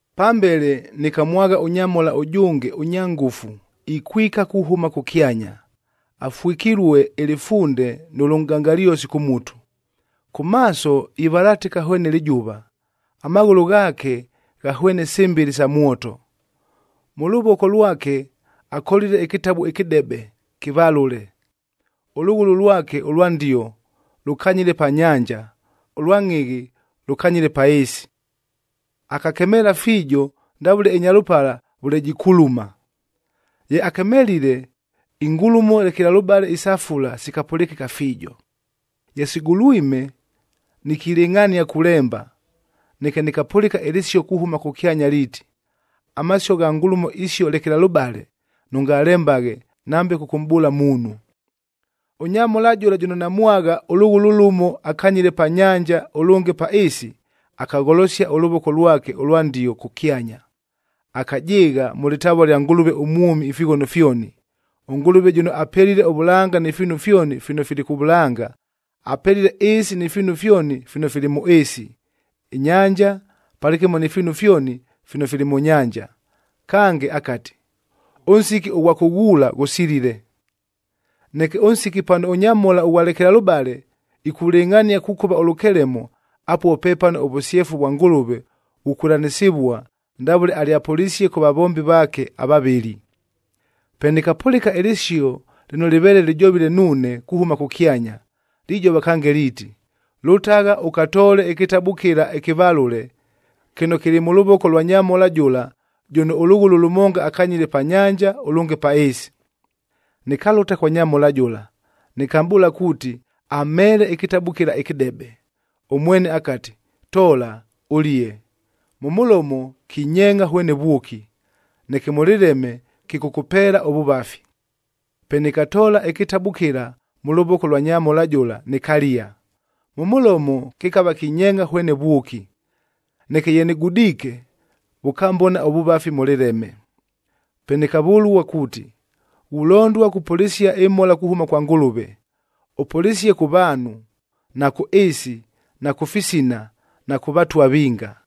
Pambele nɨkamwagha ʉnyamhola ʉjʉnge ʉnya ngʉfu ikwika kuhʉma kʉkyanya, afwɨkilue ɨlɨfunde nʉ lʉnʼgangalyosi kʉ mutu, kʉ maaso ivalatɨka hwene lɨjʉva, amaghʉlʉ ghaake ghahwene sɨmbɨlɨ sa mwoto. Mʉ lʉvoko lwake akolile ɨkɨtabu ɨkɨdebe, kɨvalʉle. Ʉlʉghʉlʉ lwake ʉlwa ndio lʉkanyile pa nyanja, ʉlwa ngʼhɨghɨ lʉkanyile pa ɨɨsi. Akakemeela fiijo ndavʉle ɨnyalʉpala vʉle jikuluma. Ye akemelile, ingulumo lekelalʉbale isa fula sikapʉlɨkɨka fiijo. Ye sigulwime, nikilɨngʼhania kulemba, neke nɨkapʉlɨka ɨlɨsio kuhʉma kʉkyanya liiti, “Amasio gha ngulumo isio lekelalʉbale, nʉngalembaghe nambe kʉkʉmʼbʉʉla muunhu!” Ʉnyamhola jʉla jʉno namwagha, ʉlʉghʉlʉ lʉmo akanyile pa nyanja, ʉlʉnge pa ɨɨsi, akagholosia ʉlʉvoko lwake ʉlwa ndio kʉkyanya. Akajɨɨgha mʉ lɨtavua lya Ngʉlʉve ʉmwʉmi ifighono fyoni, ʉNgʉlʉve jʉno apelile ʉvʉlanga ni fiinu fyoni fino fili kʉ vʉlanga, apelile ɨɨsi ni fiinu fyoni fino fili mʉ ɨɨsi, ɨnyanja palɨkɨmo ni fiinu fyoni fino fili mʉ nyanja. Kange akati, “Ʉnsiki ʉghwa kʉghuula ghusilile! Neke ʉnsiki pano ʉnyamhola ʉghwa lekelalʉbale ikulɨngʼhania kukʉva ʉlʉkelemo, apuo pepano ʉvʉsyefu vwa Ngʉlʉve vukwɨlanɨsɨvua ndavʉle alyapʉlisie kʉ vavombi vaake avavɨli.” Pe nɨkapʉlɨka ɨlɨsio lɨno lɨveele lɨjovile nuune kuhʉma kʉkyanya, lijova kange liiti, “Lʉtagha ʉkatoole ɨkɨtabu kɨla ɨkɨvalʉle kɨno kɨlɨ mʉ lʉvoko lwa nyamhola jʉla jʉno ʉlʉghʉlʉ lʉmonga akanyile pa nyanja, ʉlʉnge pa ɨɨsi.” Nɨkalʉta kwa nyamhola jʉla, nɨkamʼbʉʉla kuuti amheele ɨkɨtabu kɨla ɨkɨdebe. Ʉmwene akati, “Toola, ʉlie, mʉ mʉlomo kinyeengʼa hwene vwʉki, neke mʉ lɨleme kɨkʉkʉpeela ʉvʉvafi.” Pe nɨkatoola ɨkɨtabu kɨla mʉ lʉvoko lwa nyamhola jʉla nɨkalia, mʉ mʉlomo kɨkava kinyeengʼa hwene vwʉki. Neke ye nɨgudiike, vʉkambona ʉvʉvafi mʉ lɨleme. Pe nɨkavʉlua kuuti, “Ghulondua kupʉlɨsia ɨmhola kuhʉma kwa Ngʉlʉve. Ʉpʉlɨsie kʉ vaanhu, na kʉ ɨɨsi, na kʉ fisina, na kʉ vatwa vinga.”